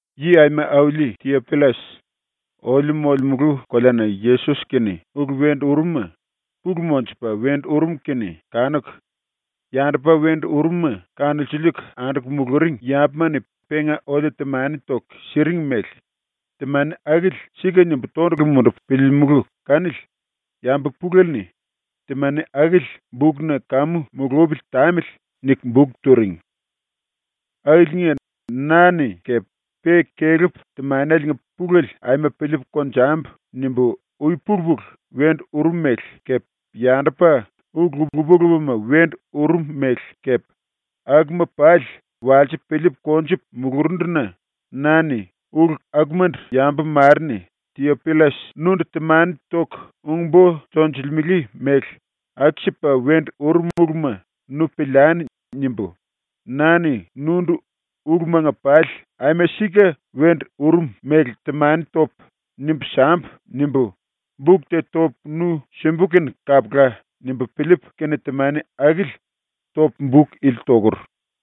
Yi aima auli Tiopillas, oliu molemulu koleana Yesos-kene ulu wendu urum-ma pulu monjupa wendu urum kene kanuku, yandupa wendu urum-ma kanulsiliiku anduku muluring yambuma-ni penga oliu temani toku siring mele, temani akili ‘Sika’ nimbu tondulu mundupu piliilimulu kanili yambu pulele-ni ‘Temani akili bukna kamu mulupili tamili.’ niku buk turing. Akiliinga, na-ni kepe pe kelepu ‘ ‘Temaneliinga pulele aima piliipu konjambu.’ nimbu ui-pulu-pulu wendu urum mele kepe yandupa ulu lupa-lupama wendu urum mele kepe akuma pali walsipu piliipu konjupu mulurundu-na na-ni ‘Ulu akumandu yambu mare-ni Tiopillas nundu temani toku ung-bo tonjilimele mele aku-sipa wendu urum uluma nu piliani.’ nimbu, ‘Na-ni nundu ulumanga pali aima sika wendu urum mele temani topu nimbu sambu.’ nimbu, buk te topu nu simbu kene kapula.’ nimbu piliipu kene temani akili topu buk ili tokur.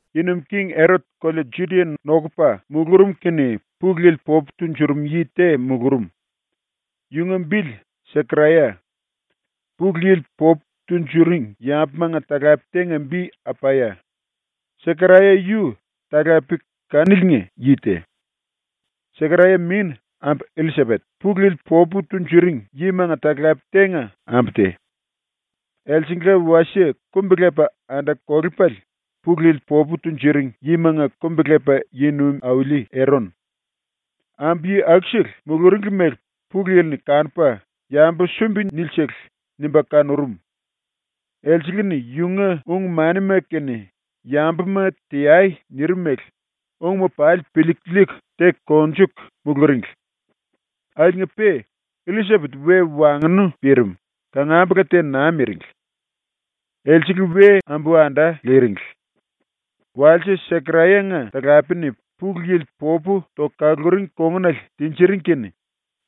Yi Nuim King Erot kolea Judia nokupa mulurum kene Pulu Yili popu tunjurum yi te mulurum, yunga bili Sekaraya. Pulu Yili popu tunjuring yambumanga talape tenga bi Apaya, Sekaraya yu talape kaniliinga yi te. Sekaraya min ambu Illisapet Pulu Yili popu tunjuring yimanga talape tenga ambu te. Elsengla wasie kumbi-lepa anda-kolepale Pulu Yili popu tunjuring yimanga kumbi-lepa yi nuim auli Eron. Ambu-yi akusele muluringli mele Pulu Yili-ni kanupa ‘Yambu sumbi nili-sele.’ nimba kanurum. Elsele-ni yunga ung-manima kene “Yambuma teai.” nirim mele ungma pali piliiku liiku teku konjuku muluringli. Akiliinga-pe Illisapet we wangnu pirim, kangambula te naa miringli. Elsele we ambu-anda liringli. Walse Sekaraya-nga talapele-ni Pulu Yili popu toku kaluring kongunale tinjiring kene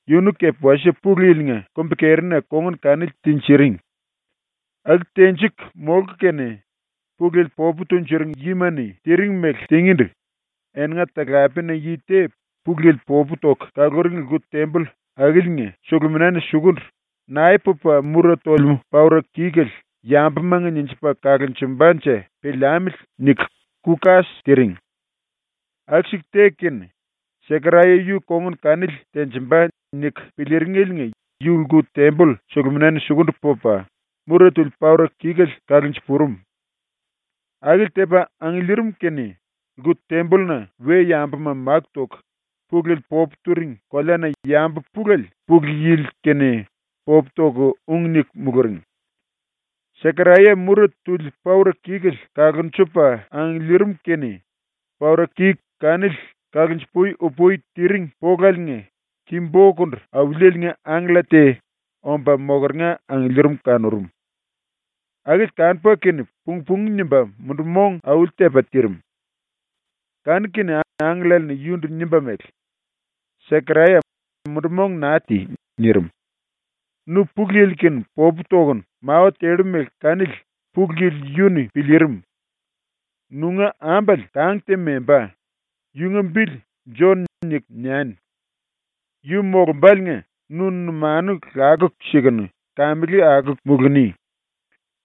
yunu kepe wasie Pulu Yili-nga kumbi-kerina kongun kanili tinjiring. Aku tenjiku molku kene, Pulu Yili popu tunjuring yima-ni tiring mele tingíndu eninga talapena yi te Pulu Yili popu toku kaluring lku-temboll akiliinga suluminana sukundu ‘Nae pupa mura tolemú paura-kikuele yambumanga ninjipa kalonjumbanje piliamili.’ niku ku-kas tiring. Aku-siku teku kene ‘Sekaraya yu kongun kanili tenjimba.’ niku piliiringeliinga yu lku-temboll suluminana sukundu pupa mura tuli paura-kikuele kalunju-purum. Akili tepa angiliirim kene lku-tembolluna we-yambuma máku toku Pulu Yili popu turing koleana yambu pulele Pulu Yili-kene popu toku ung niku muluring. ⸤Sekaraya mura tuli paura-kikuele kalunjupa angiliirim kene⸥ paura-kiku kanili kalunju-pui-upui tiring polaliinga ki-bokundu Auliele-nga angkella te omba mokeringa angiliirim kanurum. Akili kanupa kene pung-pungu nimba mundu-mong auli-tepa tirim. Kanu-kene angkellale-ni yundu nimba mele: “Sekaraya, mundu-mong naa ti.” nirim. “Nu Pulu Yili-kene popu tokunu mawa tellu mele kanili Pulu Yili yu-ni piliirim. Nunga ambale kang te membá. Yunga bili “Jon” niku niani. Yu molumbáliinga nu numanu lakuku sikunu kamele akuku muluni.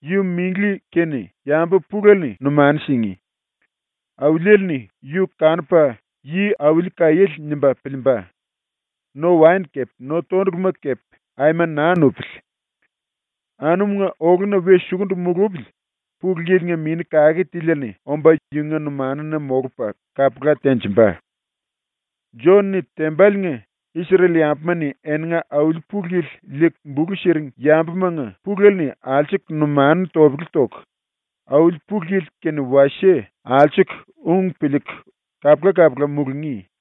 Yu minglí kene yambu pulele-ni numanu singí. Auliele-ni yu kanupa yi-auli kaiéle nimba piliimba. No-waen kepe no-tonduluma kepe aima naa nupili. Anumunga oluna we sukundu mulupili Pulu Yili-nga Mini Kake Tiliele-ni omba yunga numanuna molupa kapula tenjimba. “Jon-ni tembaliinga Isrel-yambuma-ni eninga Auli Pulu Yili liiku bulu siring yambumanga pulele-ni alsuku numanu topele toku Auli Pulu Yili kene wasie alsuku ung piliiku kapula-kapula mulungí.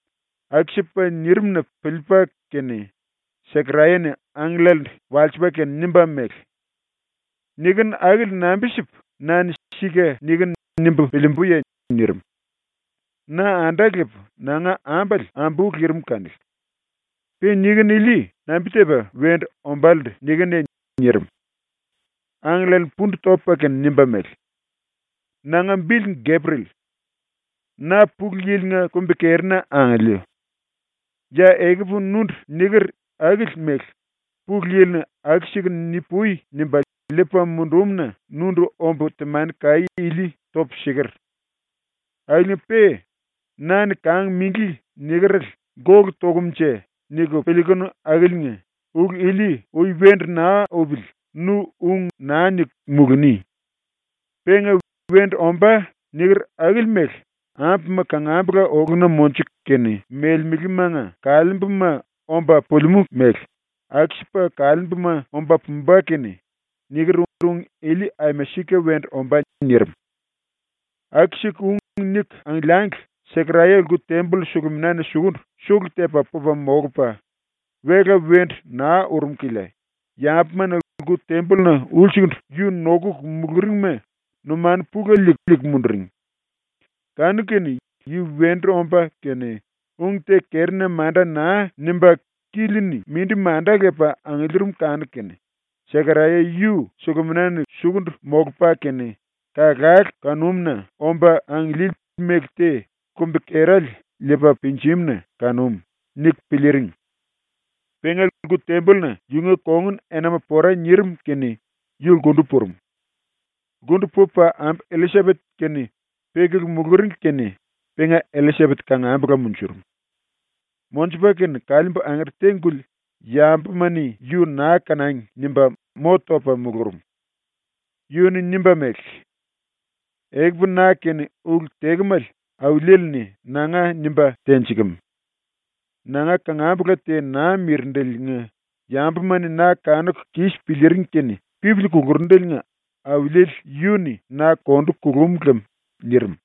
Aku-sipa nirim-na piliipa kene Sekaraya-ni angkellalendu walsipa kene nimba mele: “Nikinu akili nambi-sipu na-ni ‘Sika nikinu.’ nimbu piliimbuye?” nirim. “Na anda lepu nanga ambale ambú lirim kanili. Pe nikinu ili nambi-tepa wendu ombálendu nikinuye?” nirim. Angkellale-ni pundu topa kene nimba mele: “Nanga bili Gepriel. Na Pulu Yili-nga kumbi-kerina angiliu. Ya ekupu nundu niker akili mele Pulu Yili-ni “Aku-sikunu ni-pui.” nimba liipa mundumu-na nundu ombu temani-kaí ili topu siker. Akiliinga-pe na-ni “Kang minglí.” nikerele ‘Gólu tokumnje?’ niku piliikunu akiliinga ulu ili ui wendu naa upili nu ung naa niku muluni. Penga “Wendu ombá.” niker akili mele ambuma kangambula oluna monjuku kene melemelemanga kaliimbuma omba pulimú mele aku-sipa kaliimbuma omba pumba kene niker ung ili aima sika wendu ombá.” nirim. Aku-siku ung niku angiliangli Sekaraya lku-temboll suluminana sukundu sulu-tepa pupa molupa, wela wendu naa urum kilia yambuma-ni lku-tembolluna ulsukundu yu nokuku muluringima numanu pulele liiku munduring. Kanu-kene yu wendu omba kene ung te kerina manda naa nimba kili-ni mindi manda lepa angiliirim kanuku kene, ‘Sekaraya yu suluminana sukundu molupa kene kalkale kanúmu-na omba angiliili mele te kumbi-kerale liipa pinjim-na kanum.’ niku piliiring. Penga lku-tembolluna yunga kongun enama pora nirim kene yu lkundu purum. Lkundu pupa ⸤ambu Illisapet-kene pekulu muluringli kene⸥ penga Illisapet kangambula munjurum. Monjupa kene kaliimbu angere te-guli ‘Yambuma-ni yu naa kanangi.’ nimba mo topa mulurum. Yu-ni nimba mele: “Ekupu na-kene ulu tekemale Auliele-ni nanga nimba tenjikem. Nanga kangambula te naa mirindeliinga yambuma-ni na kanuku kis piliiring kene pipili kulurundeliinga Auliele yu-ni na kondu kulum lem.” nirim.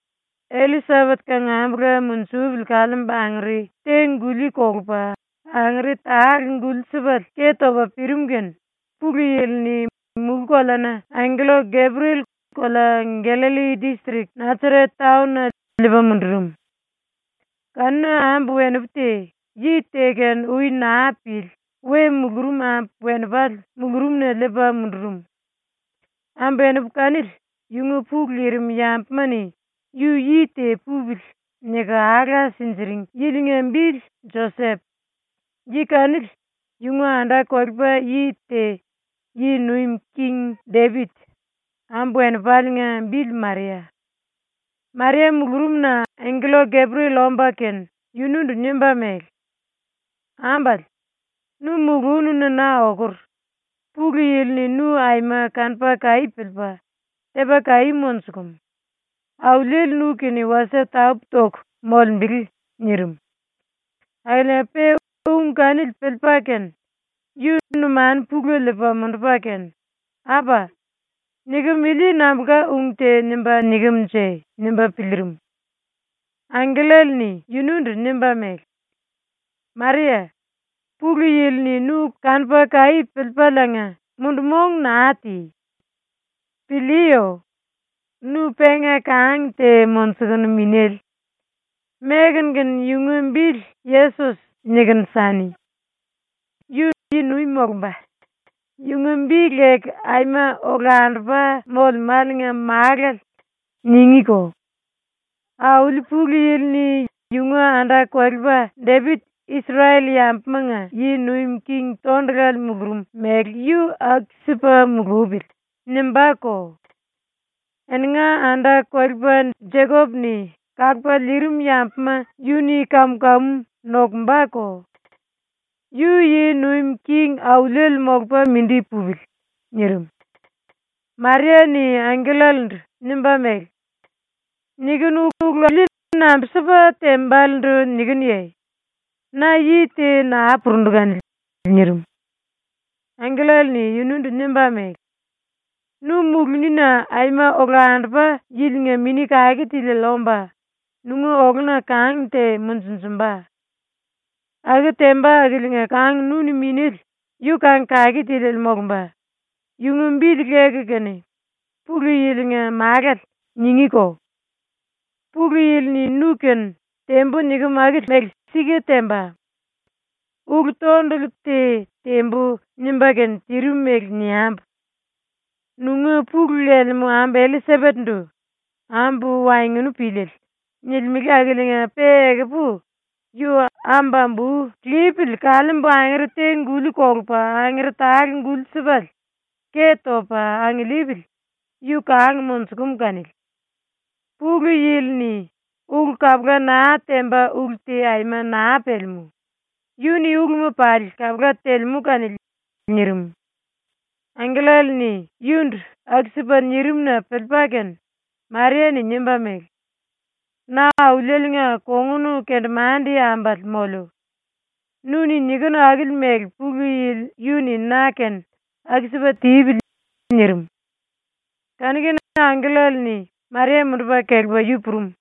⸤Illisapet kangambula munjupili kaliimbu angere te-guli kolupa⸥ angere tale-guli sipale ke topa pirim kene Pulu Yili-ni mulú-koleana angkella Gepriel kolea Gallalli distrik Nasaret taon-na liipa mundurum. Kanuna ambu-wenipu te, yi te-kene ui naa pili we mulurum ambu-wenipale mulurumna liipa mundurum. Ambu-wenipu kanili yunga pulu lirim yambuma-ni ‘Yu yi te pupili.’ niku alá sinjiring yilinga bili Josep. Yi kanili yunga anda-kolepa yi te ⸤yi nuim king⸥ Depit. Ambu-wenipaliinga bili Maria. Maria mulurumna angkella Gepriel omba kene yundu nimba mele: “Ambale, nu mulununa na okur. Pulu Yili-ni nu aima kanupa kaí piliipa tepa kaí monjukum. Auliele nu-kene wasie tapú-toku molembele.” nirim. Akiliinga-pe ung kanili piliipa kene yu numanu pulele liipa mundupa kene, ‘Apa! Nikem ili nambulka ung te nimba nikem-nje?’ nimba piliirim. Angkellale-ni yunundu nimba mele: “Maria, Pulu Yili-ni nu kanupa kaí piliikemeliinga mundu-mong naa ti. Piliiyo. Nu penga kang te monjukunu minéle. Mekunu kene yunga bili “Yesos” niku sani. Yu yi-nuim molumba, yunga bi leku ‘Aima Olandupa Molemáliinga Málale.’ ningíko; Auli Pulu Yili-ni ‘Yunga anda-kolepa Depit Isrel-yambumanga yi nuim king tondulale mulurum mele yu aku-sipa mulupili.’ nimbáko. Eninga anda-kolepa Jekop-ni kalupa liirim yambuma yu-ni kam-kamu nokumbako. Yu yi nuim king auliele molupa mindi pupili.” nirim. Maria-ni angkellalendu nimba mele: “Nikinu ulu ili nambi-sipa tembalendu nikinuye? Na yi te naa purundu kanili.” nirim. Angkellale-ni yundu nimba mele: “Nu mulunina Aima Olandupa Yili-nga Mini Kake Tiliele omba nunga oluna kang te monjunjumba. Aku temba akiliinga kang nu-ni minéle yu kang kake tiliele molumba; yunga bili leku kene ‘Pulu Yili-nga Málale’ ningíko. ⸤Pulu Yili-ni nu-kene “Tembu.” nikem akili mele sika temba. Ulu-tondulu te “Tembu.” nimba kene tirim mele niambu.⸥ Nunga pulu lelemú ambu Illisapet-ndu “Ambu wangnu píliele.” nilimele akiliinga-pe ekupu yu ámbu-ambú lipili kaliimbu angere te-guli kolupa angere tale-guli-sipale ke topa angiliipili yu kang monjukum kanili. Pulu Yili-ni ulu kapula naa temba ulu te aima naa pelemú. Yu-ni uluma pali kapula telemú kanili.” nirim. ⸤Angkellale-ni yundu aku-sipa nirim-na piliipa kene⸥ Maria-ni nimba mele: “Na Auliele-nga kongun kendemande ambale moliu. Nu-ni nikinu akili mele Pulu Yili yu-ni na-kene aku-sipa tipili.” nirim. Kanu-kene angkellale-ni Maria mundupa kelepa yu purum.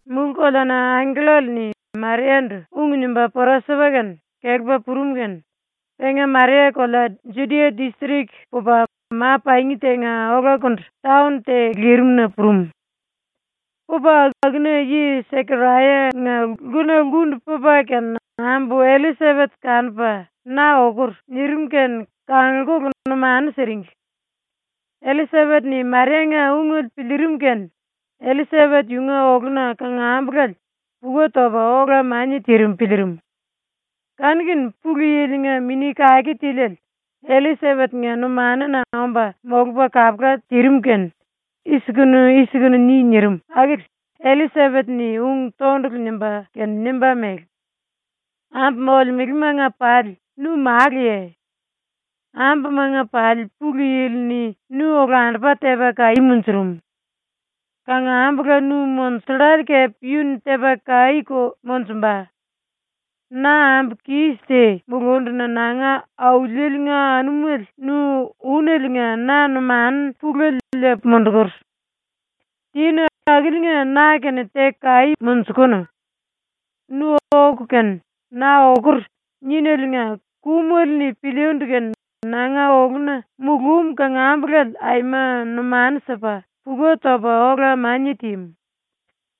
⸤Mulú-koleana angkellale-ni Maria-ndu ung nimba pora sipa kene kelepa purum kene⸥ penga Maria kolea Judia distrik pupa ma-pangi tenga olakundu taon te lirimna purum. Pupa akuna yi Sekaraya-nga lkuna lkundu pupa kene ambu Illisapet kanupa “Na okur.” nirim kene kangulkulu ⸤numanu siringli⸥. Illisapet-ni Maria-nga ungele piliirim kene Illisapet yunga oluna kangambulale puka topa ola-mania tirim piliirim. Kanu-kene Pulu Yili-nga Mini Kake Tiliele Illisapet-nga numanuna omba molupa kapula tirim kene “I-sikunu i-sikunu ni.” nirim akili Illisapet-ni ung tondulu nimba kene nimba mele: “Ambu molemelemanga pali nu maluya. Ambumanga pali Pulu Yili-ni nu olandupa tepa kaí munjurum. Kangambula nu monjullale kepe yu-ni tepa kaíko monjumba. Na ambu kis te mulunduna nanga Auliele-nga anumele nu úneliinga na numanu pulele liipu mundukur. Tinu akiliinga na-kene teku kaí monjukunu. Nu oku kene “Na okur.” níneliinga kumele-ni piliindu kene nanga oluna mulúm kangambulale aima numanu sipa puka topa ola-mania tímu.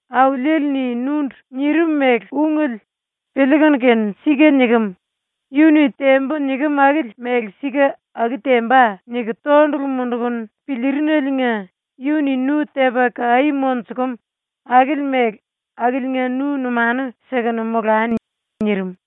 Auliele-ni nundu nirim mele ungele piliikunu kene ‘Sika nikem. Yu-ni “Tembu.” nikem akili mele sika aku temba.’ niku tondulu mundukunu piliirineliinga yu-ni nu tepa kaí monjukum akili mele akiliinga nu numanu sikunu molani.” nirim.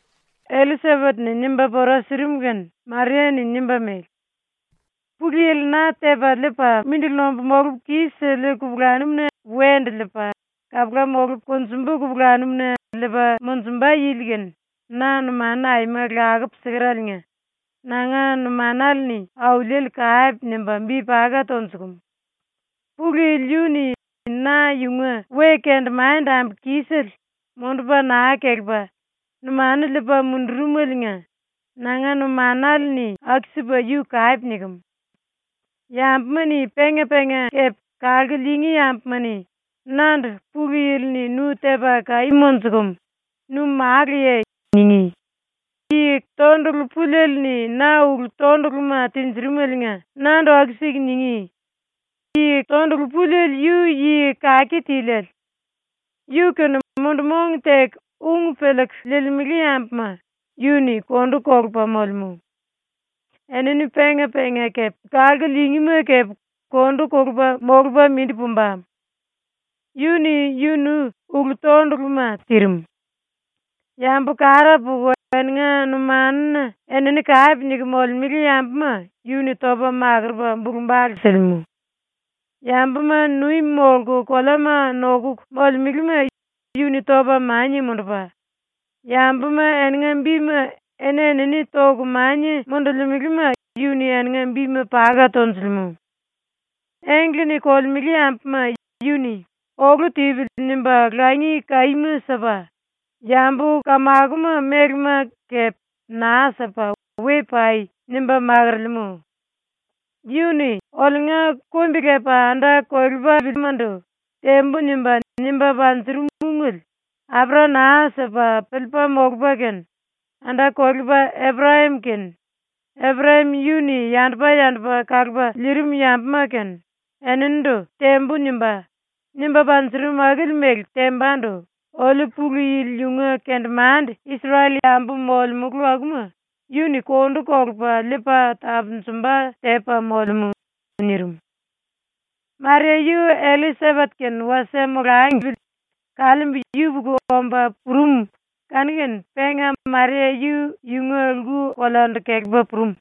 Illisapet-ni nimba pora sirim kene Maria-ni nimba mele: “Pulu Yili na Tepa Liipa, Mindili Nombu Molupu Kis-Siliu Kupulanum-na Wendu Liipa, Kapula Molupu Konjumbu Kupulanum-na Liipa Monjumba Yili kene na numanu aima lakupu sikereliinga nanga numanale-ni Auliele kape nimba bi paka tonjukumu. Pulu Yili yu-ni na yunga we-kendemande-ambu kisele mundupa naa kelepa numanu liipa mundurumeliinga nanga numanale-ni aku-sipa yu kape nikem. Yambuma-ni penga-penga kepe kalku liingí yambuma-ni nandu “Pulu Yili-ni nu tepa kaí monjukum. Nu maluya.” ningí. Tondulu Pulieli-ni na ulu-tonduluma tinjirimeliinga nandu aku-siku ningí. Tondulu Puliele yu yi kake tiliele. Yu-kene mundu-mong teku ung piliiku liilimele yambuma yu-ni kondu kolupa molemú. Enini penga-penga kepe kalku liingíma kepe kondu kolupa molupa mindi pumba. Yu-ni yunu ulu-tonduluma tirim. Yambu kara puku eninga numanuna enini kape niku molemele yambuma yu-ni topa makurupa bulu-bale silimú. Yambuma nuim molku koleama nokuku molemelema yu-ni topa mania mundupa, yambuma eninga bima eni-enini toku mania mundulimelema yu-ni eninga bima paka tonjulemú. Engle-ni kolemele yambuma yu-ni ‘Olu tipili.’ nimba langi kaíma sipa, yambu kamakoma mélema kepe naa sipa “We pai.” nimba makorolemú. Yu-ni oliunga kumbi-lepa anda-kolepalimandu “Tembu.” nimba, nimba panjurum ungele apera naa sipa piliipa molupa kene, ⸤anda-kolepa⸥ Eprayam kene, Eprayam yu-ni yandupa-yandupa kalupa liirim yambuma kene, eninindu “Tembu.” nimba, nimba panjurum akili mele tembandu oliu Pulu Yili yunga kendemande Isrel-yambu molemulu akuma yu-ni kondu kolupa liipa tapunjumba tepa molemú.” nirim. Maria yu Illisapet kene wasie molangli kaliimbu yupuku omba purum kanu-kene penga Maria yu yunga lku-koleandu kelepa purum.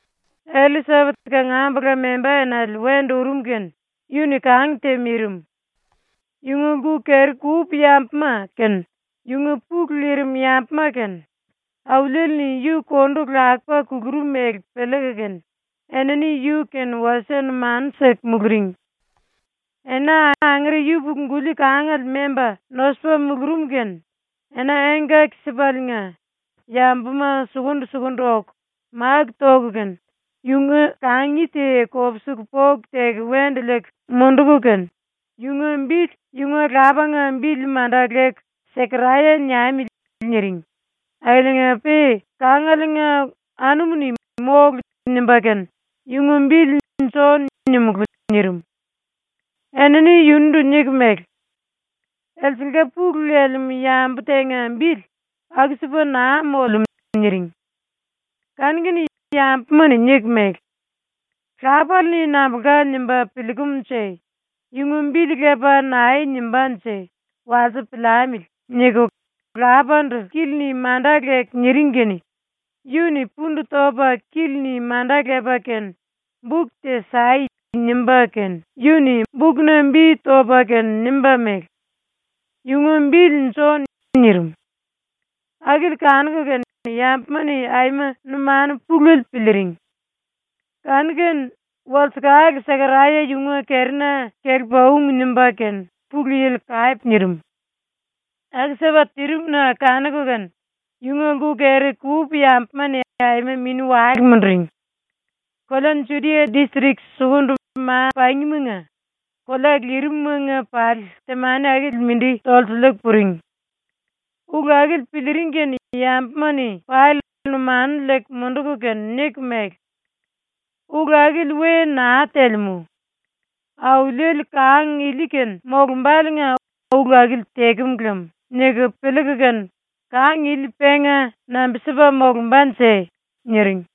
Illisapet kangambula membá enale wendu urum kene yu-ni kang te mirim. Yunga lku-keri-kupu yambuma kene yunga pulu lirim yambuma kene Auliele-ni yu kondu lakupa kulurum mele piliiku kene enini yu-kene wasie numanu siku muluring. Ena angere yupuku-guli kangale memba nosupa mulurum kene ena engkaki-sipaliinga yambuma sukundu-sukundu oku máku toku kene yunga kangi te kopsiku poku teku wendu liiku munduku kene, yunga bili yunga lapanga bili manda leku “‘Sekaraya’ niamili.” niring akiliinga-pe kangalenga anumu-ni “Mólu.” nimba kene “Yunga bili ‘Jon’ nimulú.” nirim. Enini yundu niku mele: “Elsengla pulu lelemú yambu tenga bili aku-sipa naa molemú.” niring. Kanu-kene yambuma-ni niku mele: “lápale-ni nambulka nimba piliikemunje, yunga bili lepa nae nimbánje, walsipu piliamili.” niku lapandu kili-ni manda leku niring kene yu-ni pundu topa kili-ni manda lepa kene “Buk te sai.” nimba kene, yu-ni bukna bi topa kene nimba mele: “Yunga bili Jon.” nirim. Akili kanuku kene yambuma-ni aima numanu pulele piliiring. Kanu-kene walsekale Sekaraya yunga kerina kelepa ung nimba kene Pulu Yili kape nirim. Aku-sipa tirim-na kanuku kene yunga lku-keri-kupu yambuma-ni aima mini-wale munduring. Kolea Judia distrik sukundu ma-pangimanga kolea lirimumanga pali temani akili mindi tolsiliiku puring. Ulu akili piliiring kene yambuma-ni pali numanu liiku munduku kene niku mele: “Ulu akili we naa telemú. Auliele kang ili-kene molumbáliinga ulu akili tekem lem.” niku piliiku kene “Kang ili penga nambi-sipa molumbanje?” niring.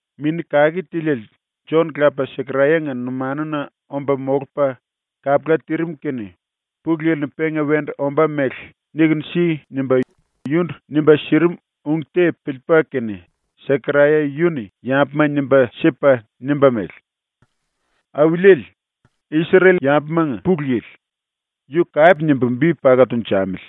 Mini Kake Tiliele Jon-lapa Sekaraya-nga numanuna omba molupa kapula tirim kene Pulu Yili-ni penga wendu ombá mele “Nikunu si.” nimba yundu nimba sirim ung te piliipa kene, Sekaraya yu-ni yambuma nimba sipa nimba mele: “Auliele, Isrel-yambumanga Pulu Yili, yu kape nimbu bi paka tunjamili.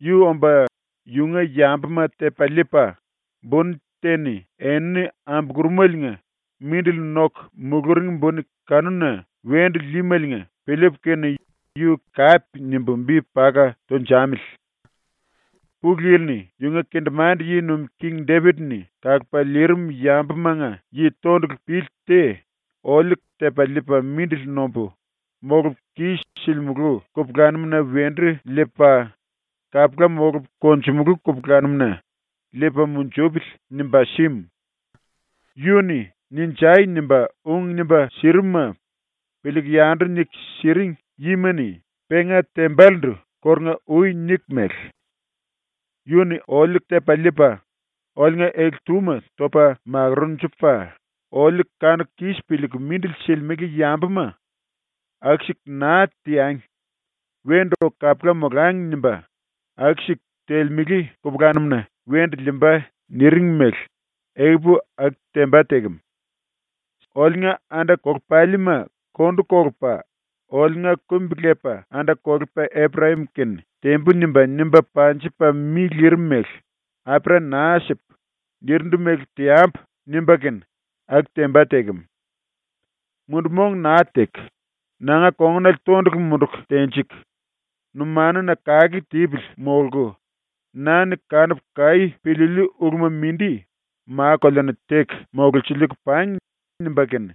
Yu omba yunga yambuma tepa liipa buni te-ni enini ambulurumeliinga mindili noku muluring buni kanuna wendu líímeliinga piliipu kene yu kape nimbu bi paka tunjamili. Pulu Yili-ni yunga kendemande ⸤yi nuim king⸥ Depit-ni kalupa liirim yambumanga yi tondulu pili te oliu ‘Tepa liipa mindili nombu molupu kis-silimulu kupulanum-na wendu liipa, kapula molupu konjumulú kupulanum-na liipa munjupili.’ nimba símu. (Yu-ni “Ninjai!” nimba ung nimba sirimuma piliiku yandu niku siring yima-ni penga tembalendu kórunga-ui niku mele:) “Yu-ni oliu tepa liipa oliunga ele-túma topa makurunjupa, oliu kanuku kis piliiku mindili silimele yambuma ‘Aku-siku naa teangi. Wendu oku kapula molangi.’ nimba aku-siku telemele kupulanum-na wendu liimba.” niring mele ekupu aku temba tekem. Oliunga anda-kolepalima kondu kolupa, oliunga kumbi-lepa anda-kolepa Eprayam-kene “Tembu.” nimba, nimba panjipa mi lirim mele “apera naa sipu, nirindu mele teambu.” nimba kene aku temba tekem. ‘Mundu-mong naa teku, nanga kongunale tondulu munduku tenjiku, numanuna kake tipili molku na-ni kanupu kaí piliiliu uluma mindi ma-koleana teku mololsiliiku pangi.’ nimba kene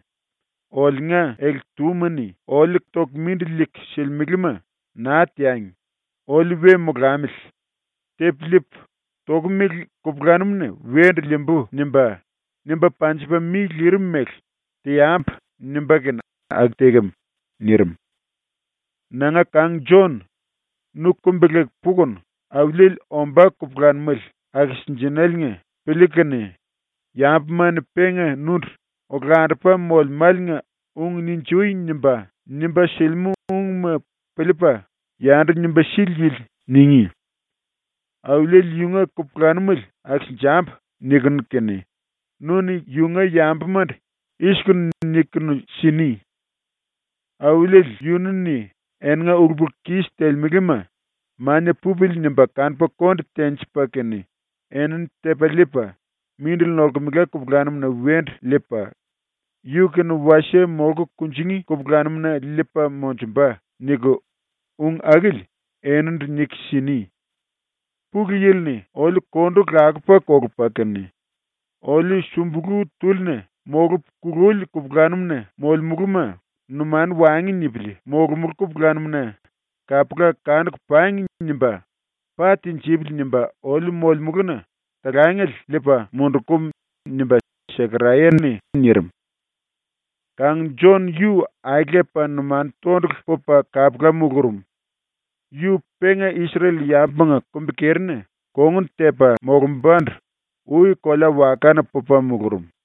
oliunga ele-túma-ni oliu toku mindili liiku silimelema ‘Naa teangi. Oliu we molamili. Tepu liipu, tokomele kupulanum-na wendu liimbu.’ nimba, nimba panjipa mi lirim mele ‘Teambu.’ nimba kene aku tekem.” ⸤nirim.⸥ “Nanga kang ⸤Jon⸥, nu kumbi-leku pukunu Auliele ombá kupulanumele akisinjenéliinga piliikunu kene, yambuma-ni penga nundu ‘Olandupa Molemáliinga ung “Ninjui.” nimba, nimba silimú ungma piliipa yandu nimba sili yili’ ningí. ‘Auliele yunga kupulanumele akisinjambu.’ nikunu kene nu-ni yunga yambumandu i-sikunu nikunu sini: “Auliele yunu-ni eninga ulu-pulu-kis telemelema ‘Mania pupili.’ nimba kanupa konde tenjipa kene enini tepa liipa mindili nolkemela kupulanum-na wendu liipa, yu-kene wasie molku kunjingí kupulanum-na liipa monjumba.” niku, ung akili eninindu nikunu sini. Pulu Yili-ni oliu kondu lakupa kolupa kene oliu sumbulú túlina molupu kululi kupulanum-na molomulúma numanu waengu nipili molomulú kupulanum-na ‘Kapula kanuku pangi.’ nimba ‘Pa tinjipili.’ nimba oliu molemuluna talangele liipa mundukum.” nimba Sekaraya-ni nirim. Kang Jon yu ai lepa numanu tondulu pupa kapula mulurum. Yu penga Isrel-yambumanga kumbi-kerina kongun tepa molumbandu ui kolea-wakana pupa mulurum.